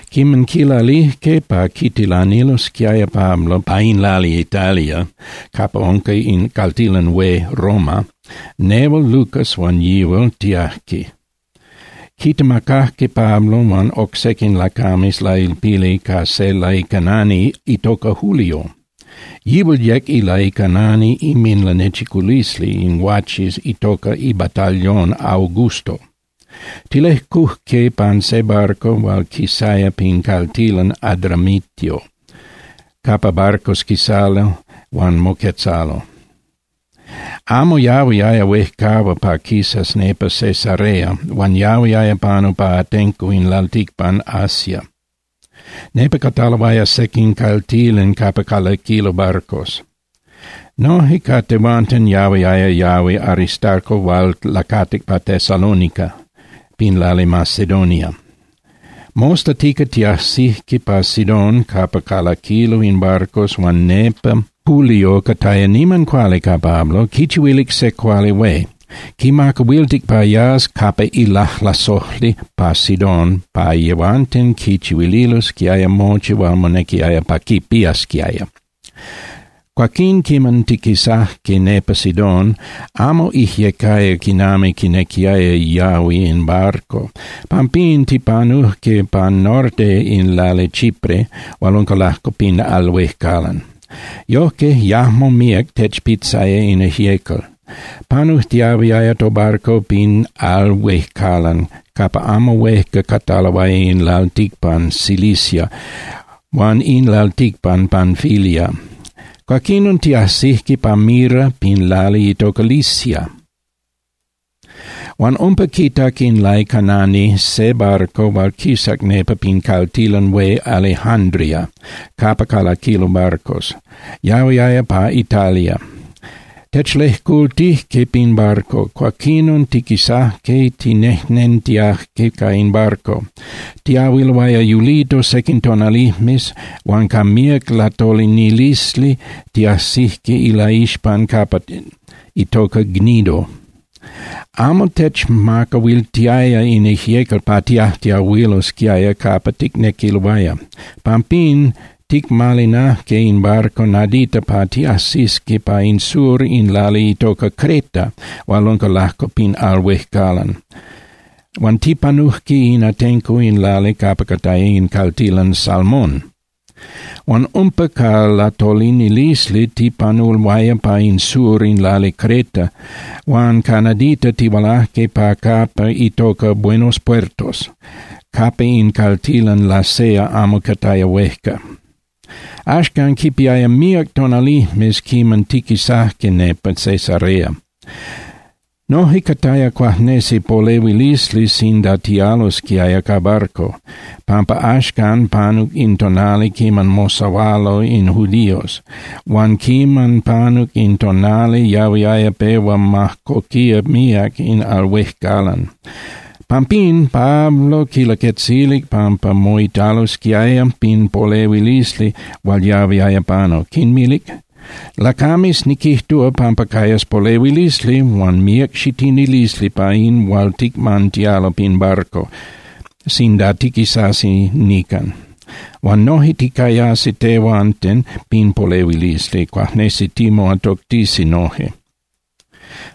Quiman quilalijque pa quitilanilosquiaya Pablo pa in lali Italia capa unca in caltilan hué Roma, nehual Lucas huan yihual tiajque. Quitemacajque Pablo huan oc sequin lacames lailpili ca se laicanani itoca Julio. Yihual yec ilaicanani inminlanechiculisli in guaches itoca iBatallón Augusto. Tilejcujque pan se barco hual quisaya pin caltilan Adramitio capa barcos quisalo huan moquetzalo. Amo yahuiaya huejcahua pa quisas nepa Cesarea huan yahuiaya panu pa atenco in lalticpan Asia, nepa cataloaya sequin caltilan capa calaquilo barcos. Noje ca tehuanten yahuiaya yahui Aristarco hual lacatic pa Tesalónica pin lali Macedonia. Mostatica tiajsijque pa Sidón capa calaquilo in barcos huan nepa Julio cataya niman cuali ca Pablo, quichihuilic se cuali hué. Quimacahuiltic pa yas capa ilajlasojli pa Sidón pa yehuanten quichihuililosquiaya mochi hual monequiaya pa quipiasquiaya. Cuaquín quiman tiquisajque nepa Sidón, amo ijyecaya quinami quinequiaya yahui in barco. Pampín tipanujque pan norte in lali Chipre hual unca lajco pin al huejcalan. Yojque yajmo míac techpitzaya in ijyecal. Panujtiahuiaya tobarco pin al huejcalan capa amo huejca cataloaya in lalticpan Cilicia huan in lalticpan Panfilia. Cuaquinon tiajsijque pa Mira pin lali itoca Licia. Huan umpa quitac in laicanani se barco hual quisac nepa pin caltilan hué Alejándria capa calaquilo barcos, yahuiaya pa Italia. Techlejcultijque pin barco, cuaquinon tiquisajque tinejnentiajque ca in barco. Tiyahuiloaya yulito sequin tonalijmes huan ca míac latolinilisli tiajsijque ilaixpan capa itoca Gnido. Amo techmacahuiltiaya in ijyecal pa tiajtiahuilosquiaya capa ticnequiloaya. Pampín ticmalinajque in barco nadita pa tiajsisqui pa in sur in lali itoca Creta hual unca lajco pin al huejcalan. Huan tipanujque in atenco in lali capa cataya in caltilan Salmón. Huan umpa ca latolinilisli tipanuloaya pa in sur in lali Creta huan ca nadita tihualajque pa capa itoca Buenos Puertos, capa in caltilan Lasea amo cataya huejca. Axcan quipiaya míac tonalijmes quiman tiquisajque nepa Cesarea. Noje cataya cuajnesi polehuilisli sinda tialosquiaya ca barco, pampa axcan panuc in tonali quiman mosahualo in judíos, huan quiman panuc in tonali yahuiaya pehua majcoquía míac in al huejcalan. Pampín Pablo quinlaquetzilic pampa moitalosquiaya pin polehuilisli hual yahuiaya panu, quinmilic: —Lacames, niquijtúa pampa cayas polehuilisli huan míac xitinilisli pa in hual ticmantialo pin barco sinda tiquisasi nican. Huan noje ticayasi tehuanten pin polehuilisli, cuajnesi timoatoctisi noje.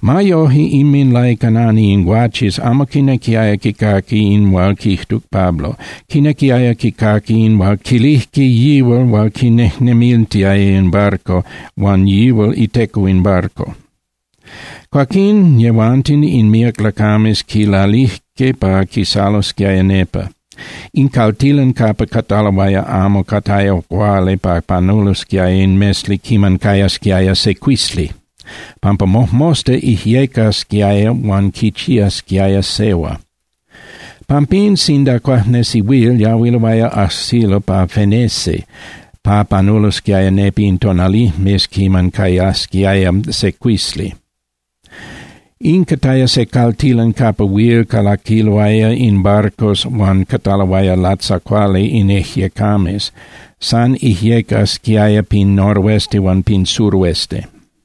Ma yoje, inminlaicanani in guaches amo quinequiaya quicaqui in hual quijtuc Pablo. Quinequiaya quicaqui in hual quilijque yihual hual quinejnemiltiaya in barco huan yihual iteco in barco. Cuaquín yehuanten in míac lacames quilalijque pa quisalosquiaya nepa. In caltilan capa cataloaya amo cataya cuali pa panulosquiaya in mesli quiman cayasquiaya secuisli, pampa mojmosta ijyecasquiaya huan quichiasquiaya sehua. Pampín, sinda cuajnesi huil, yahuiloaya ajsilo pa Fenece pa panulosquiaya nepa in tonalijmes quiman cayasquiaya secuisli. In cataya se caltilan capa huil calaquiloaya in barcos huan cataloaya latzacuali in ijyecames. San ijyecasquiaya pin noroeste huan pin suroeste.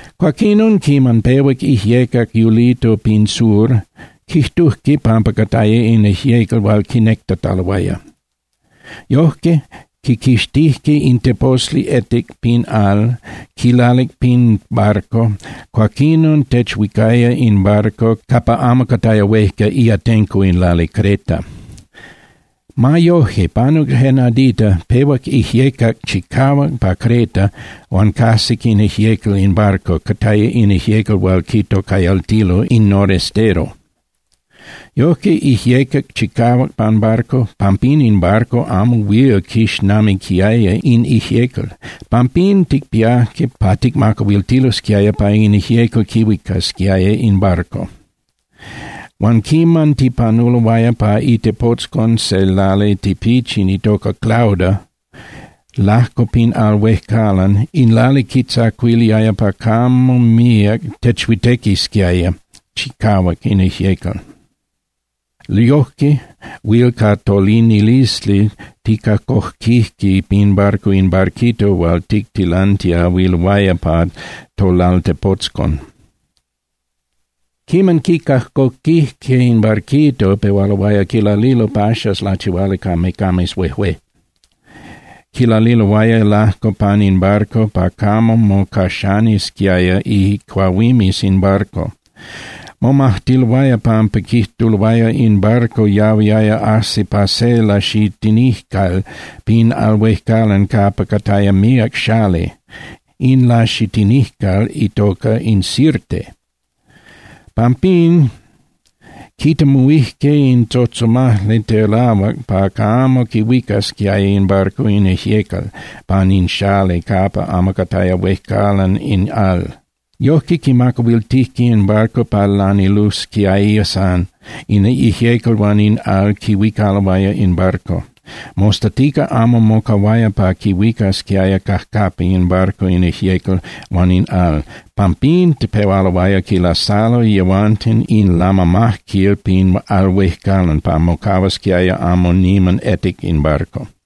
Cuaquinon quiman pehuac ijyecac yulito pin sur, quijtujque pampa cataya in ijyecal hual quinectataloaya. Yojque quiquixtijque in teposli etic pin al, quilalic pin barco, cuaquinon techhuicaya in barco capa amo cataya huejca iatenco in lali Creta. Ma yoje, panuc je nadita, pehuac ijyecac chicahuac pa Creta huan cajsic in ijyecal in barco, cataya in ijyecal hual quitocayaltilo in Norestero. Yojque ijyecac chicahuac pan barco, pampín in barco amo huil quixnamiquiaya in ijyecal. Pampín, ticpiajque pa ticmacahuiltilosquiaya pa in ijyecal quihuicasquiaya in barco. Huan quiman tipanuloaya pa itepotzcon se lali tipichin itoca Clauda lajco pin al huejcalan, in lali quitzacuiliaya pa camo míac techhuitequisquiaya chicahuac in ijyecal. Yojque huil ca tolinilisli ticajcoquijque pin barco in barquito hual tictilantiahuiloaya pa tolaltepotzcon. Quiman ticajcoquijque in barquito, pehualoaya quilalilo paxas lachihuali ca mecames huejué, quilalililoaya lajco pan in barco pa camo mocaxanisquiaya icuahuimes in barco. Momajtiloaya pampa quijtuloaya in barco yahuiaya ajsi pa se laxitinijcal pin al huejcalan capa cataya míac xali, in laxitinijcal itoca in Sirte. Pampín quitemuhuijque in tzotzomajli telahuac pa camo quihuicasquiaya in barco in ijyecal pan in xali capa amo cataya huejcalan in al. Yojque quimacahuiltijque in barco pa lanilusquiaya san, in ijyecal huan in al quihuicaloaya in barco. Mostatica amo mocahuaya pa quihuicasquiaya cajcapa in barco in ijyecal huan in al, pampín pehualoaya quilasalo yehuanten in lamamajquil pin al huejcalan pa mocahuasquiaya amo niman etic in barco.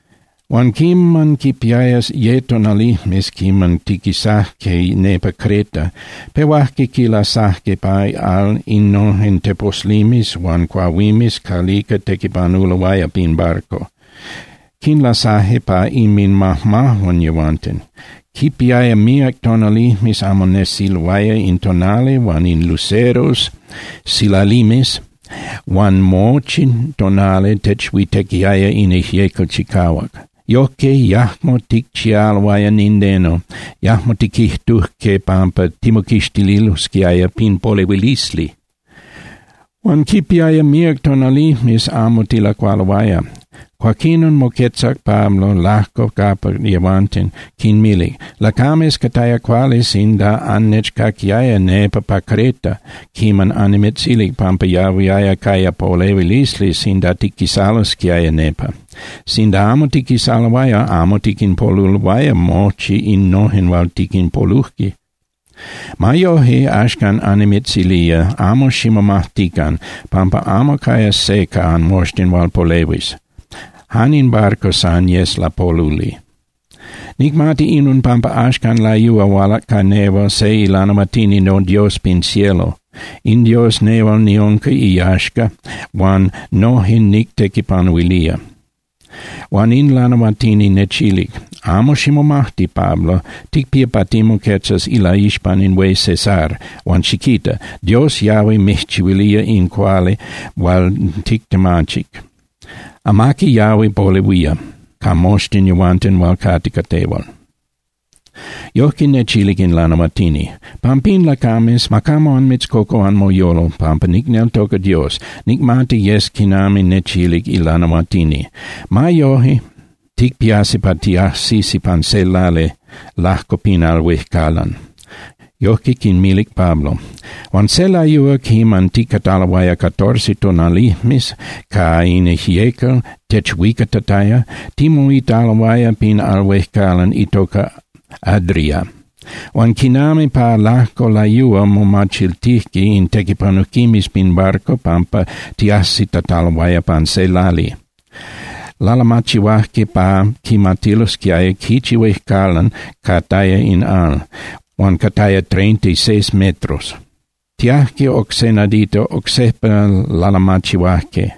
Huan quiman quipiaya ye tonalijmes quiman tiquisajque nepa Creta, pehuajque quilasajque pa al innojen teposlimes huan cuahuimes calica tequipanuloaya pin barco, quinlasajque ca inminmajmajuan yehuanten. Quipiaya míac tonalijmes amo nesiloaya in tonali huan in luceros (silalimes), huan mochi tonali techhuitequiaya in ijyecal chicahuac. Yojque yajmo ticchialoaya nindeno, yajmo tiquijtujque pampa timoquixtililosquiaya pin polehuilisli. Huan quipiaya míac tonalijmes amo tilacualoaya. Cuaquinon moquetzac Pablo lajco capa yehuanten, quinmilic: —Lacames, cataya cuali sinda annechcaquiaya nepa pa Creta quiman annimitzilic pampa yahuiaya caya polehuilisli sinda tiquisalosquiaya nepa. Sinda amo tiquisaloaya, amo tiquinpoluloaya mochi innojen hual tiquinpoluje. Ma yoje, axcan annimitzilía, amo ximomajtican, pampa amo cayas se ca anmoxtin hual polehuis. Jan in barco san yes lapoluli. Nicmati inon pampa axcan layúa hualac ca nehual se ilanahuatini noDios pin cielo. In Dios nehual niunca iyaxca huan noje nictequipanuilía. Huan in lanahuatini nechilic: “Amo ximomajti, Pablo, ticpía pa timoquetzas ilaixpan in hué Cesar, huan xiquita. Dios yahui mijchihuilía in cuali hual tictemachic. Amaqui yahui polehuía ca moxtin yehuanten hual cate ca tehual.” Yojque nechilic in lanahuatini. Pampín, lacames, ma camo anmitzcocu anmoyolo, pampa nicneltoca Dios. Nicmati yes quinami nechilic ilanahuatini. Ma yoje, ticpiasi pa tiajsisi pan se lali lajco pin al huejcalan. Yojque quinmilic Pablo. Huan se layúa quiman ticataloaya catorce tonalijmes ca in ijyecal techhuicatataya, timoitaloaya pin al huejcalan itoca Adria. Huan quinami pa lajco layúa momachiltijque in tequipanujquimes pin barco pampa tiajsitataloaya pan se lali. Lalamachihuajque pa quimatilosquiaya quichi huejcalan cataya in al, huan cataya treintiseis metros. Tiajque oc se nadita, oc sejpa lalamachihuajque,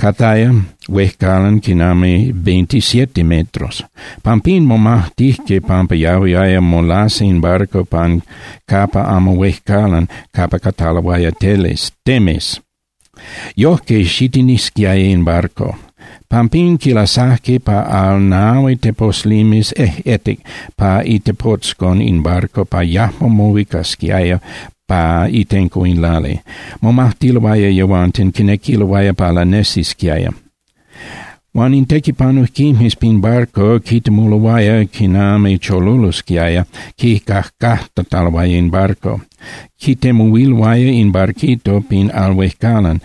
cataya huejcalan quinami veintisiete metros. Pampín momajtijque pampa yahuiaya molasa in barco pan capa amo huejcalan capa cataloaya teles (temes). Yojque xitinisquiaya in barco. Pampín quinlasajque pa al nahui teposlimes ejꞌetic pa itepotzcon in barco pa yajmo mohuicasquiaya pa itenco in lali. Momajtiloaya yehuanten, quinequiloaya pa lanesisquiaya. Huan in tequipanujquimes pin barco quitemuloaya quinami cholulosquiaya quicajcajtataloaya in barco. Quitemuhuiloaya in barquito pin al huejcalan.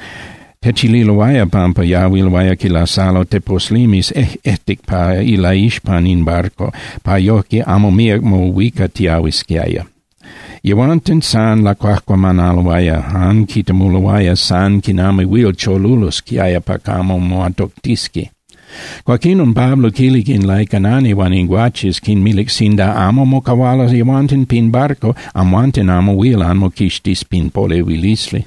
Techililoaya pampa yahuiloaya quilasalo teposlimes ejꞌetic pa ilaixpan in barco pa yojque amo míac mohuicatiahuisquiaya. Yehuanten san lacuajcuamanaloaya, jan quitemuloaya san quinami huil cholulosquiaya pa camo moatoctisqui. Cuaquinon Pablo quilic in laicanani huan in guaches, quinmilic: —Sinda amo mocahualo yehuanten pin barco, amhuanten amo huil anmoquixtis pin polehuilisli.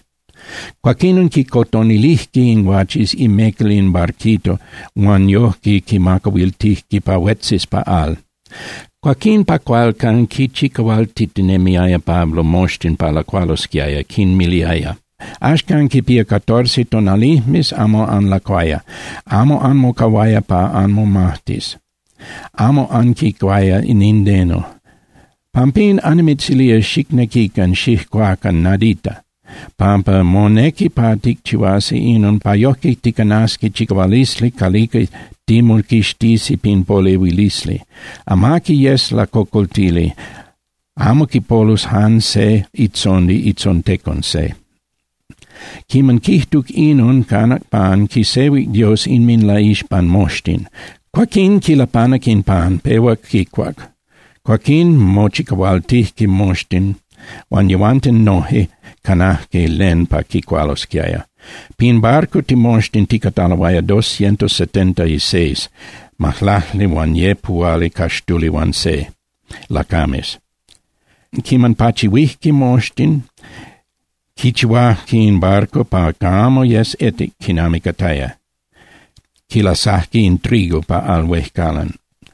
Cuaquinon quicotonilijque in guaches imecal in barquito huan yojque quimacahuiltijque pa huetzis pa al. Cuaquín pa cualcan quinchicahualtitinemiaya Pablo moxtin pa lacualosquiaya, quinmiliaya: —Axcan quipía catorce tonalijmes amo anlacuaya. Amo anmocahuaya pa anmomajtis, amo anquicuaya nindeno. Pampín annimitzilía xicnequican xijcuacan nadita, pampa monequi pa ticchihuasi inon pa yojque ticanasi chicahualisli calica timoquixtisi pin polehuilisli. Amaqui yes lacocoltili, amo quipolus jan se itzondi itzontecon se. Quiman quijtuc inon, canac pan, quisehuic Dios inminlaixpan moxtin, cuaquin quilapanac in pan, pehuac quicuac. Cuaquín mochicahualtijque moxtin huan yehuanten noje canajque len pa quicualosquiaya. Pin barco timoxtin ticataloaya doscientos setenta y seis (majlaclihuanyepuhualicaxtulihuanse) lacames. Quiman pachihuijque moxtin, quichihuajque in barco pa camo yes etic quinami cataya, quilasajque in trigo pa al huejcalan.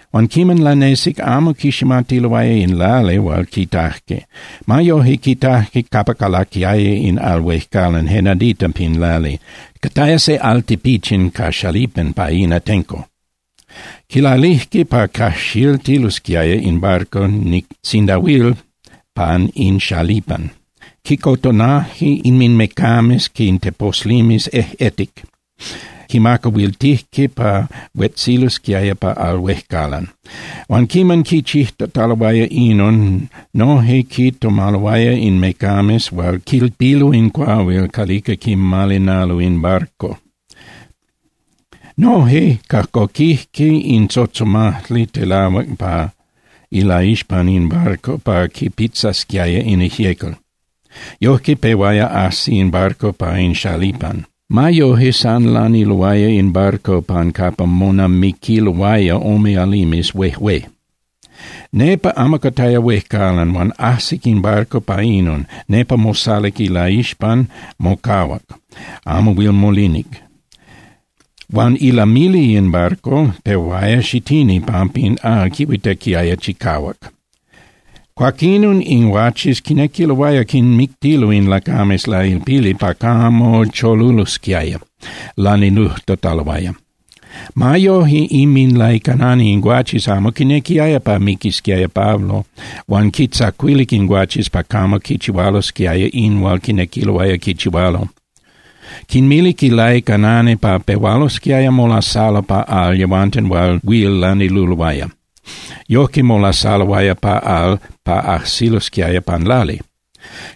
Huan quiman lanesic, amo quiximatiloaya in lali hual quitajque. Ma yoje, quitajque capa calaquiaya in al huejcalan je nadita pin lali, cataya se al tipichin ca xalipan pa in atenco. Quilalijque pa cajxiltilosquiaya in barco sinda huil pan in xalipan. Quicotonaje inminmecames in teposlimes ejꞌetic, quinmacahuiltijque pa huetzilosquiaya pa al huejcalan. Huan quiman quichijtataloaya inon noje quitomaloaya in mecames hual quilpilo in cuahuil calica quimalinalo in barco. Noje cajcoquijque in tzotzomajli telahuac pa ilaixpan in barco pa quipitzasquiaya in ijyecal, yojque pehuaya ajsi in barco pa in xalipan. Ma yoje, san laniluaya in barco pan capa monamiquiloaya ome alimes huejué. Nepa amo cataya huejcalan huan ajsic in barco pa inon, nepa mosaluc ilaixpan, mocahuac, amo huil molinic. Huan ilamili in barco pehuaya xitini pampa in al quihuitequiaya chicahuac. Cuaquinon in guaches quinequiloaya quinmictilo in lacames lailpili pa camo cholulosquiaya lanilujtataloaya. Ma yoje, inminlaicanani in guaches amo quinequiaya pa miquisquiaya Pablo huan quintzacuilic in guaches pa camo quichihualosquiaya in hual quinequiloaya quichihualo. Quinmilic in laicanani pa pehualosquiaya molasalo pa al yehuanten hual huil laniluloaya. Yojque molasaloaya pa al pa ajsilosquiaya pan lali.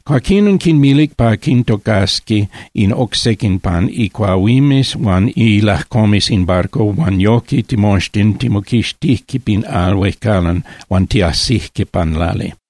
Cuaquín quinmilic pa quintocasqui in oc sequin pan icuahuimes huan ilajcomes in barco huan yojque timoxtin timoquixtijque pin al huejcalan huan tiajsijque pan lali.